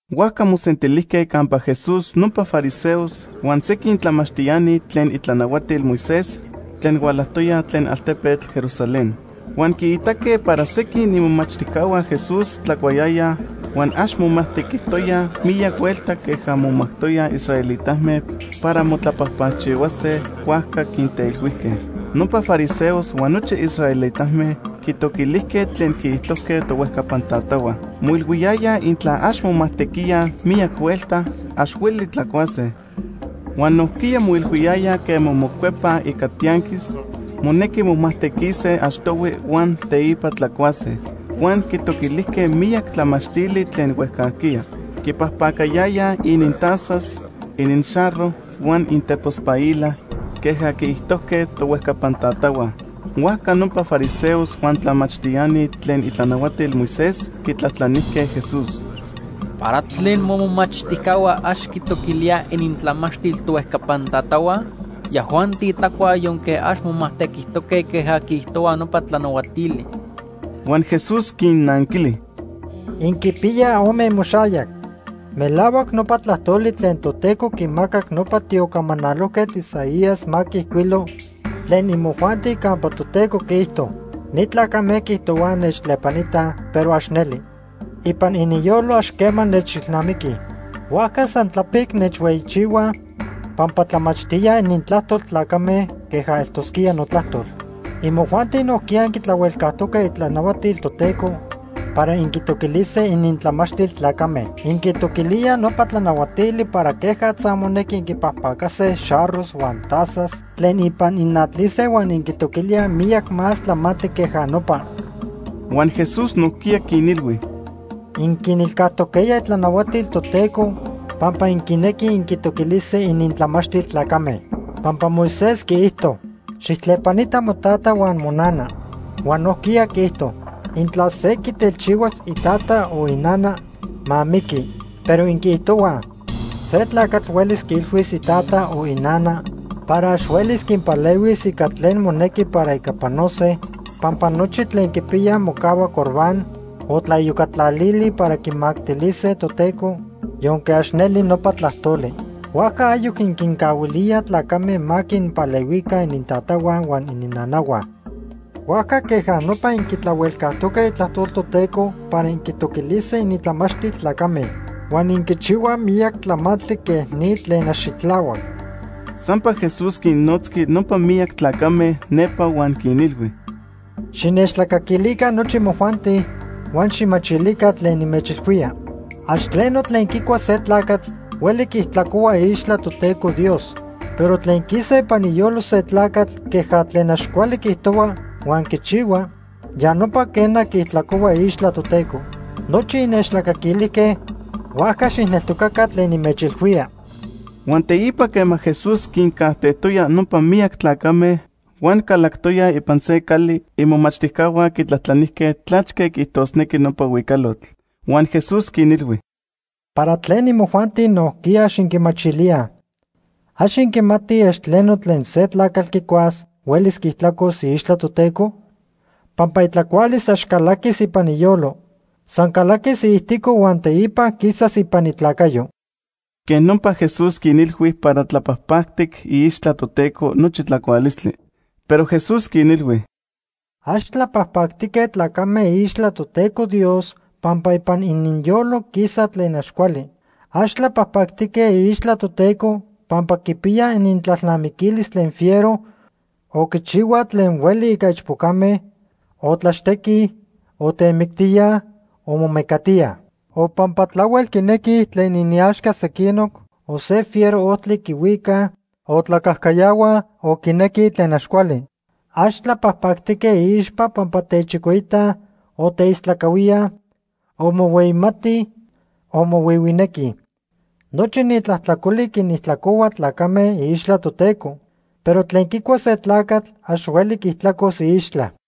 Huajca mosentilijque campa Jesús nopa fariseos huan sequin tlamachtiani tlen itlanahuatil Moisés tlen hualajtoyaj tlen altepetl Jerusalén. Huan quiitaque para sequin imomachtijcahua Jesús tlacuayayaj huan ax momajtequijtoyaj miyac huelta queja momajtoyaj israelitame para motlapajpacchihuase, huajca quinteilhuijque. Nopa fariseos huan nochi israelitame quitoquilijque tlen quiijtojque tohuejcapan tatahua. Moilhuiyayaj intla ax momajtequíaj miyac huelta, ax hueli tlacuase. Huan nojquiya moilhuiyayaj quema mocuepaj ica tianquis, monequi momajtequise achtohui huan teipa tlacuase. Huan quitoquilijque miyac tlamachtili tlen huejcajquiya. Quipajpacayayaj inintazas, ininxarro huan inintepospaila queja quiijtojque tohuejcapan tatahua. Huajca nopa fariseos huan tlamachtiani tlen itlanahuatil Moisés quitlajtlanijque Jesús: ―¿Para tlen momomachtijcahua ax quitoquilíaj inintlamachtil tohuejcapan tatahua? Yajuanti tlacuaj yonque ax momajtequijtoque queja quiijtohua nopa tlanahuatili. Huan Jesús quinnanquili: ―¡Inquipiyaj ome imoxayac! Melahuac nopa tlajtoli tlen Toteco quimacac nopa tiocamanalojquetl Isaías ma quiijcuilo tlen imojuanti campa Toteco quiijto: ‘Ni tlacame quiijtohuaj nechtlepanitaj, pero ax neli. Ipan ininyolo ax quema nechilnamiquij. Huajca san tlapic nechhueyichihuaj, pampa tlamachtíaj inintlajtol tlacame queja eltosquía notlajtol.’ Imojuanti nojquiya inquitlahuelcajtoque itlanahuatil Toteco para inquitoquilise inintlamachtil tlacame. Inquitoquilíaj nopa tlanahuatili para quejatza monequi inquipajpacase xarros huan tazas tlen ipan inatlise huan inquitoquilíaj miyac más tlamantli queja nopa. Huan Jesús nojquiya quinilhui: ―Inquinilcajtoquejya itlanahuatil Toteco pampa inquinequij inquitoquilise inintlamachtil tlacame. Pampa Moisés quiijto: ‘Xijtlepanita motata huan monana’, huan nojquiya quiijto: ‘Intla se quitelchihuas itata o inana, ma miqui.’ Pero inquiijtohuaj se tlacatl huelis quiilhuis itata o inana para ax huelis quinpalehuis ica tlen monequi para ica panose pampa nochi tlen quipiyaj mocahua Corbán o tlaiyocatlalili para quimactilise Toteco, yonque ax neli nopa tlajtoli. Huajca ayoc inquincahuilíaj tlacame ma quinpalehuica inintatahua huan ininnanahua. Huajca queja nopa inquitlahuelcajtoque itlajtol Toteco para inquitoquilise inintlamachtil tlacame. Huan inquichihuaj miyac tlamantli quej ni tlen ax xitlahuac. Sampa Jesús quinnotzqui nopa miyac tlacame nepa huan quinilhui: ―Xinechtlacaquilica nochi imojuanti, huan xijmachilica tlen nimechilhuía. Ax tleno tlen quicua se tlacatl hueli quiijtlacohua iixtla Toteco Dios. Pero tlen quisa ipan iyolo se tlacatl queja tlen ax cuali quiijtohua huan quichihua, ya nopa quena quiijtlacohua iixtla Toteco. Nochi innechtlacaquilijque, huajca xijneltocaca tlen nimechilhuía. Huan teipa quema Jesús quincajtejtoya nopa miyac tlacame huan calactoya ipan se cali, imomachtijcahua quitlajtlanijque tlachque quiijtosnequi nopa huicalotl. Huan Jesús quinilhui: ―¿Para tlen imojuanti nojquiya ax inquimachilíaj? ¿Ax inquimatij ax tleno tlen se tlacatl quicuas huelis quiijtlacos iixtla Toteco? Pampa itlacualis ax calaquis ipan iyolo. San calaquis iijtico huan teipa quisas ipan itlacayo. Quej nopa Jesús quinilhui para tlapajpactic iixtla Toteco nochi tlacualistli. Pero Jesús quinilhui: ―Ax tlapajpactique tlacame iixtla Toteco Dios pampa ipan ininyolo quisa tlen ax cuali. Ax tlapajpactique iixtla Toteco pampa quipiyaj inintlalnamiquilis tlen fiero, o quichihuaj tlen hueli ica ichpocame, o tlaxtequij, o temictíaj o momecatíaj. O pampa tlahuel quinequij tlen iniaxca sequinoc, o se fiero ojtli quihuicaj, o tlacajcayahuaj o quinequij tlen ax cuali. Ax tlapajpactique iixpa pampa techicoitaj, o teistlacahuíaj, o mohueyimatij o mohuihuinequij. Nochi ni tlajtlacoli quinijtlacohua tlacame iixtla Toteco. Pero tlen quicua se tlacatl ax hueli quiijtlacos iixtla.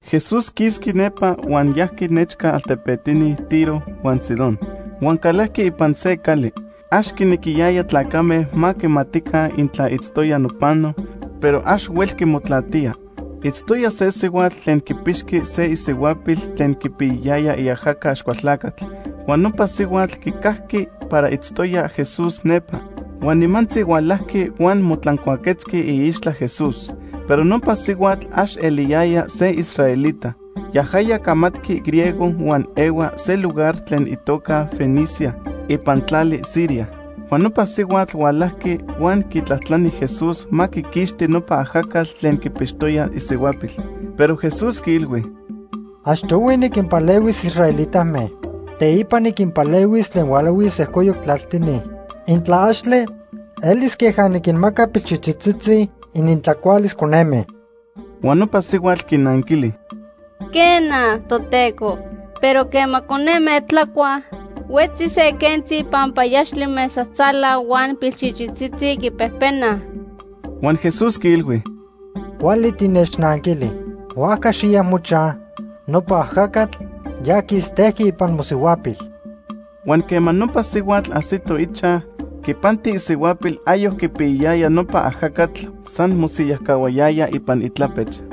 Jesús quisqui nepa huan yajqui nechca altepetini Tiro huan Sidón huan calajqui ipan se cali. Ax quinequiyaya tlacame ma quimatica intla itztoya nopano, pero ax huelqui motlatía. Itztoya se sihuatl tlen quipixqui se isihuapil tlen quipiyayaya iajaca Axcualtlacatl. Huan nopa sihuatl quicajqui para itztoya Jesús nepa. Huan nimantzi hualajqui huan motlancuaquetzqui iixtla Jesús. Pero nopa sihuatl ax eliyaya se israelita. Yajaya camatqui griego huan ehua se lugar tlen itoca Fenicia ipan tlali Siria. Huan nopa sihuatl hualajqui huan quitlajtlani Jesús ma quiquixti nopa ajacatl tlen quipixtoya isihuapil. Pero Jesús quiilhui: ―Achtohui niquinpalehuis israelitame. Teipa niquinpalehuis tlen hualahui sejcoyoc tlaltini. Intla axtle, elis queja niquinmaca pilchichitzitzi inintlacualis coneme. Huan nopa sihuatl quinanquili: ―Quena, Toteco, pero quema coneme tlacuaj, huetzi se quentzi panpayaxtli mesajtzala huan pilchichitzitzi quipejpenaj. Huan Jesús quiilhui: ―Cuali tinechnanquili, huajca xiya mochaj; nopa ajacatl ya quistejqui ipan mosihuapil. Huan quema nopa sihuatl ajsito ichaj, quipanti isihuapil ayoc quipiyayaya nopa ajacatl, san mosiyajcahuayaya ipan itlapech.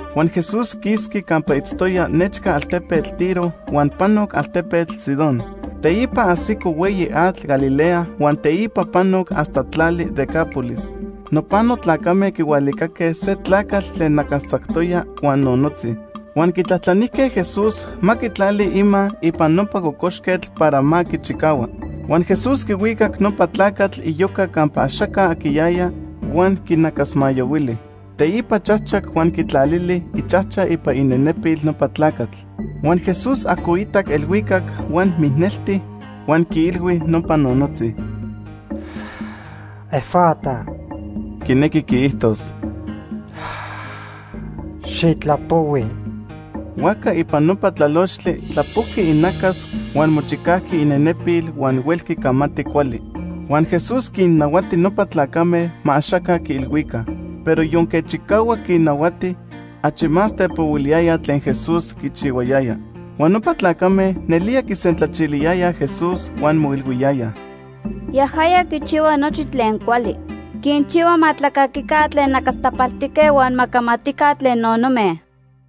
Huan Jesús quisqui campa itztoya nechca altepetl Tiro huan panoc altepetl Sidón. Teipa ajsico hueyi atl Galilea huan teipa panoc hasta tlali Decápolis. Nopano tlacame quihualicaque se tlacatl tlen nacastzactoya huan nonotzi, huan quitlajtlanijque Jesús ma quitlali ima ipan nopa cocoxquetl para ma quichicahua. Huan Jesús quihuicac nopa tlacatl iyoca campa axaca aquiyaya, huan quinacasmayahuili. Teipa chajchac huan quitlalili ichajcha ipan inenepil nopa tlacatl. Huan Jesús ajcoitac elhuicac huan mijnelti huan quiilhui nopa nonotzi: “¡Efata!” (quinequi quiijtos: “¡Xitlapohui!”) Huajca ipan nopa tlalochtli tlapojqui inacas huan mochicajqui inenepil huan huelqui camati cuali. Huan Jesús quinnahuati nopa tlacame ma axaca quiilhuica. Pero yonque chicahuac quinnahuati, achi más tepohuiliyayaj tlen Jesús quichihuayaya. Huan nopa tlacame nelía quisentlachiliyayaj Jesús huan moijilhuiyayaj: “Yajaya quichihua nochi tlen cuali. Quinchihua ma tlacaquica tlen nacastapaltique huan ma camatica tlen nonome.”